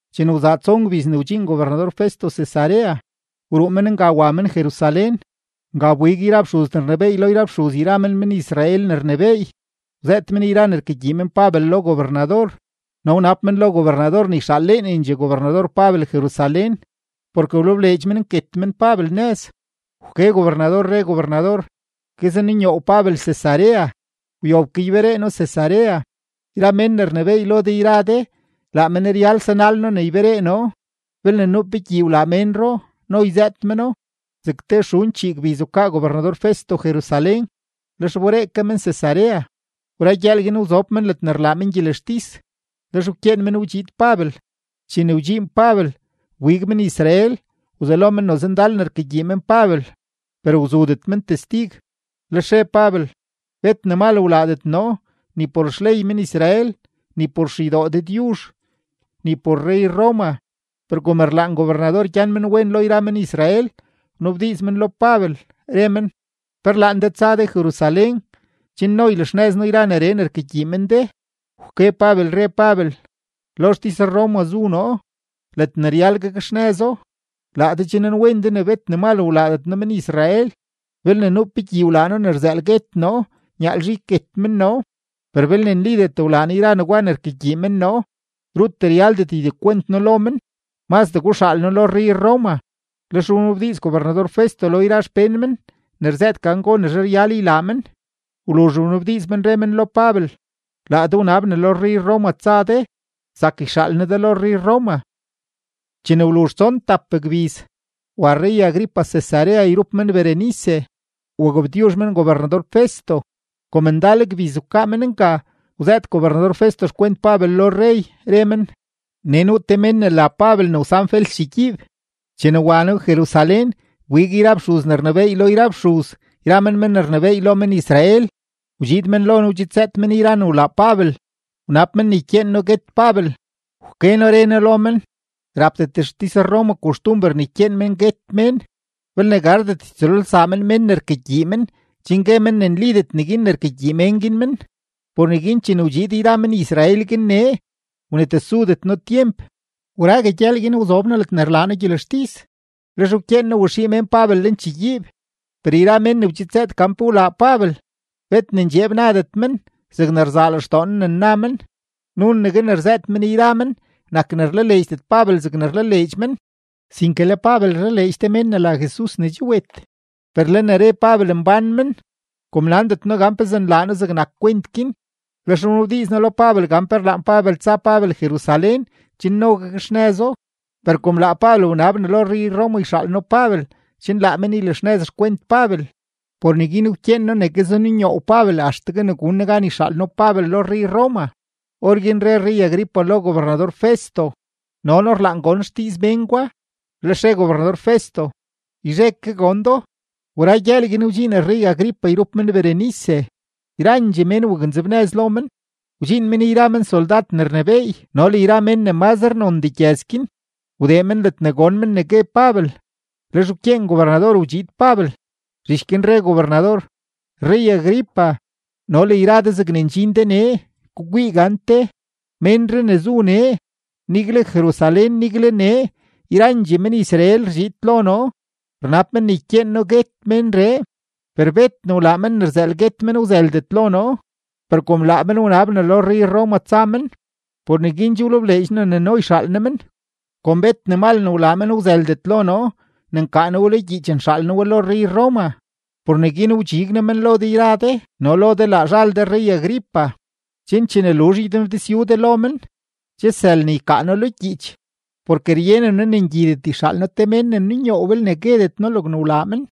Chene wzaa tson gbiz ne wdxiin gobernador-Festo Cesarea, wruu men nga wa men Jerusalén. Nga wbig yra fxuz ne rnebééy lo yra fxuz yra men men-Israel ne rnebééy, wzëët men yra ne rkagyii men Pabel lo gobernador. No wnab men lo gobernador ne yxaaleenendxee gobernador Pabel Jerusalén, porke wlebleedx men nket men Pabel nëz. Wke gobernador, re gobernador: ―Guezenunyoow Pabel Cesarea; wyob ke yberee noo Cesarea. Yra mén ne rnebééy lo de yra de, laa men ryal sanal noo ne yberee noo, belne nuu pe gyii wlaa ménro, no yzëët meno. Zeg te xun chii gbiz wkaa gobernador-Festo Jerusalén, lex wberee ke men Cesarea. Wra gyëël guin wzob men ledne rlaa men gyelextis, lex wkyeen men wdxiid Pabel. Chene wdxiin Pabel, wbig men-Israel, wzelo men noze ndal ne rkagyii men Pabel, per wzudet men testig. Lex re Pabel: ―Bet ne mal wlaadet noo, ni por xley men-Israel, ni por xeydoo Dëdyuzh, ni por rrey-Roma. Per kom rlaan gobernador gyan men wen lo yra men-Israel, wnabdiiz men lo Pabel, re men: ―¿Pe rlaan de tsa de Jerusalén, chen no ylaxnëz noo yra neree ne rkagyii men de? Wke Pabel, re Pabel: ―Lo xtis-Roma zu noo, ledne ryal gakxnëzo. Laa de che nanwen de ne bet ne mal wlaadet noo men-Israel. Belne nuu pe gyii wlaa noo ne rzëël guet noo, nyaalzhe yket men noo; per belne nlidet wlaa noo yra negwa ne rkagyii men noo, rut ryaldet ydekwent noo lo men. Mazdee guxaal noo lo rrey-Roma. Lex wnabdiiz gobernador-Festo lo yra xpén men ne rzëët gan gonezhe ryal ylaa men. Wluzh wnabdiiz men, re men lo Pabel: ―Laa de wnab ne lo rrey-Roma tsa de; zak yxaal noo de lo rrey-Roma. Chene wluzh tson tap gbiz, wa rrey-Agripa Cesarea yrup men Berenice, wagabtyuzh men gobernador-Festo. Kom ndal gbiz wkaa men nga, wzëët gobernador-Festo xkwent Pabel lo rrey, re men: ―Nee nuu te mén ne la Pabel ne wsan Fels chegyiib. Chene wa noo Jerusalén, wbig yra fxuz ne rnebééy lo yra fxuz yra men men ne rnebééy lo men-Israel, wdxiid men lo noo wzëët men yra ne wlaa Pabel, wnab men ne ykyeen noo guet Pabel. Wke noo re noo lo men, rapdet xtis-Roma koxtumber ne ykyeen men guet mén belne gardet ytsëlolsaa men men ne rkagyii men chen gue men ne nlidet neguin ne rkagyii mén guin men. Por neguin chene wdxiid yra men-Israel guin nee, wnetesudet noo tyemp; wrague gyëël guin wzob noo ledne rlaa noo gyelextis, lex wkyeen noo waxii mén Pabel lenchegyiib. Per yra mén ne wdxidzëët gan pe wlaa Pabel, bet ne ndxeeb nadet men zegne rzaa lextoo noo ne nna men. Nunegue ne rzëët men yra men nak ne rlaleedxdet Pabel zegne rlaleedx men, sinke le Pabel rlaleedx te mén ne la Jesus ne che wet, per le ne re Pabel mbán men. Kom nandet noo gan pezee nlaa noo zegnak kwent guin, lex wnabdiiz noo lo Pabel gan pe rlaan Pabel tsa Pabel Jerusalén chen no gakxnëzo. Per kom laa Pabel wnab ne lo rrey-Roma yxaal noo Pabel chen laa men ylaxnëz xkwent Pabel, por neguin wkyeen noo ne guezenunyoow Pabel axtegue ne gun noo gan yxaal noo Pabel lo rrey-Roma. Orguin re rrey-Agripa lo gobernador-Festo: ―No noo rlaan gon xdiiz mén gwa. Lex re gobernador-Festo: ―Yzhe ke gon do. Wra gyëël guin, wdxiin rrey-Agripa yrup men Berenice. Yrandxee mén waknzebnëz lo men. Wdxiin men yra men soldad ne rnebééy no le yra mén ne mazre nondee gyëz guin, wdee men ledne gon men ne gue Pabel, lex wkyeen gobernador wdxiid Pabel. Zhich guin re gobernador: ―Rrey-Agripa no le yra de zegne ndxin de nee, gukwii gante: Ménree ne zu nee, nigle Jerusalén, nigle nee, yrandxee men-Israel rdxiid lo noo, rnab men ne ykyeen noo guet ménree. Per bet ne wlaa men ne rzëël guet men wzëldet lo noo. Per kom laa men wnab ne lo rrey-Roma tsa men, por neguin che wlebleedx noo ne no yxaal noo men. Kom bet ne mal ne wlaa men wzëldet lo noo ne nkaa noo we lo gyiich nxaal noo we lo rrey-Roma, por neguin wdxig noo men lo de yra de no lo de laa zhal de rrey-Agripa, chen chene luzh ynabdizyu de lo men, che sël ne ykaa noo lo gyiich. Porke ryenen noo ne ngyidet yxaal noo te mén ne nunyoow belne guedet noo logne wlaa men.